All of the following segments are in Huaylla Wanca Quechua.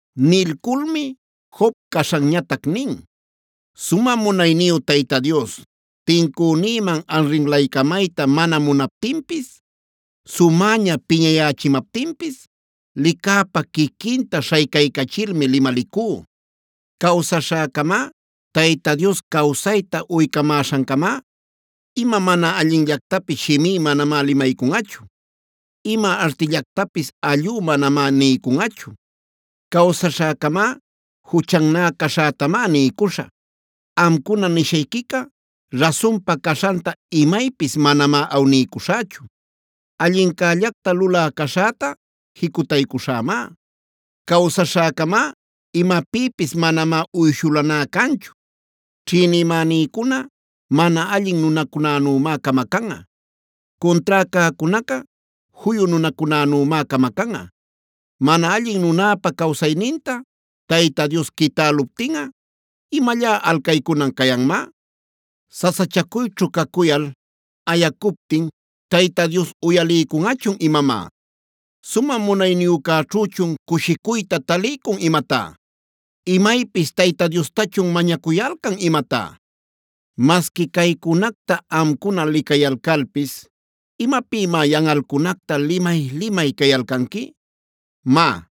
Nilculmi Job caśhanñatac nin: “Sumä Munayniyu Tayta Dios tincünïman arrinlaycamayta mana munaptinpis, sumäña piñayächimaptinpis licäpa quiquinta śhaycaycachilmi limalicú. Cawsaśhäcamá, Tayta Dios cawsayta uycamäśhancamá, ima mana allinllactapis shimí manamá limaycunꞌachu; ima artillactapis allú manamá niycunꞌachu. Cawsaśhäcamá, juchannä caśhätamá niycuśhä; amcuna nishayquica rasunpa caśhanta imaypis manamá awniycuśhächu. Allincällacta lulä caśhäta jicutaycuśhämá; cawsaśhäcamá imapïpis manamá uyshuläná canchu. “Ćhïnimänïcuna mana allin nunacunänümá camacanꞌa; cuntrá cäcunaca juyu nunacunänümá camacanꞌa. Mana allin nunäpa cawsayninta Tayta Dios quitäluptinꞌa ¿imallá alcaycunan cayanmá? ¿Sasachacuyćhu cacuyal ayacuptin Tayta Dios uyaliycunꞌachun imamá? ¿Sumä Munayniyücäćhüchun cushicuyta taliycun imatá? ¿Imaypis Tayta Diostachun mañacuyalcan imatá? “Masqui caycunacta amcuna licayalcalpis, ¿imapïmá yanꞌalcunacta limay-limay cayalcanqui? Má,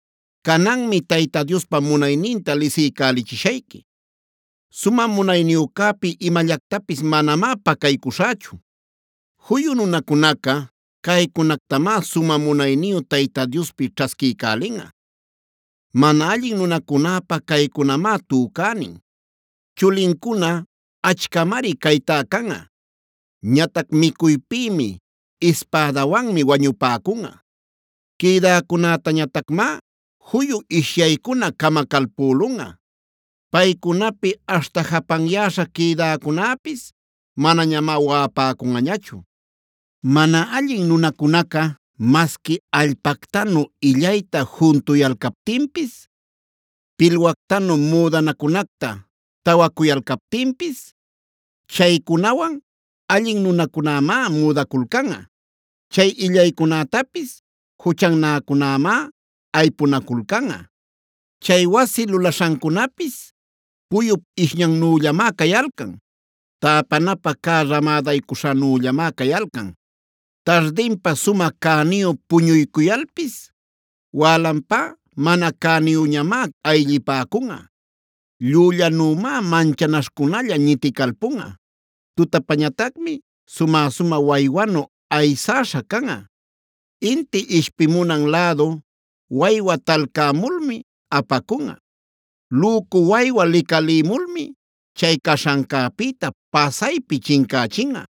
cananmi Tayta Diospa munayninta lisiycälichishayqui. Sumä Munayniyücäpi imallactapis manamá pacaycuśhächu. “Juyu nunacunaca caycunactamá sumä munayniyu Tayta Diospi ćhasquiycälinꞌa; Mana allin nunacunäpä caycunamá tücänin. Chulincuna achcamari caytá canꞌa; ñatac micuypïmi, ispädawanmi wañupäcunꞌa. Quïdäcunätañatacmá juyu ishyaycuna camacalpülunꞌa. Paycunapi aśhta japanyäśha quïdäcunäpis manañamá waꞌapäcunꞌañachu. “Mana allin nunacunaca masqui allpactanu illayta juntuyalcaptinpis, pilwactanu müdanacunacta tawacuyalcaptinpis, chaycunawan allin nunacunämá müdaculcanꞌa; chay illaycunätapis juchannäcunämá aypunaculcanꞌa. Chay wasi lulaśhancunapis puyup ishñannüllamá cayalcan; täpanapä cä ramädaycuśhanüllamá cayalcan. Tardinpa sumä cäniyu puñuycuyalpis, wälanpá mana cäniyüñamá ayllipäcunꞌa. Llüllanümá manchanaśhcunalla ñiticalpunꞌa; tutapañatacmi sumä-sumä waywanu aysäśha canꞌa. Inti ishpimunan lädu waywa talcämulmi apacunꞌa; lücu waywa licalïmulmi chay caśhancäpïta pasaypi chincächinꞌa.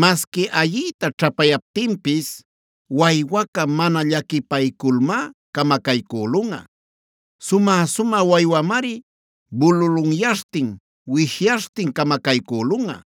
Masqui ayiyta ćhapayaptinpis waywaca mana llaquipayculmá camacaycülunꞌa. Sumä-sumä waywamari bululunyaśhtin, wishyaśhtin camacaycülunꞌa.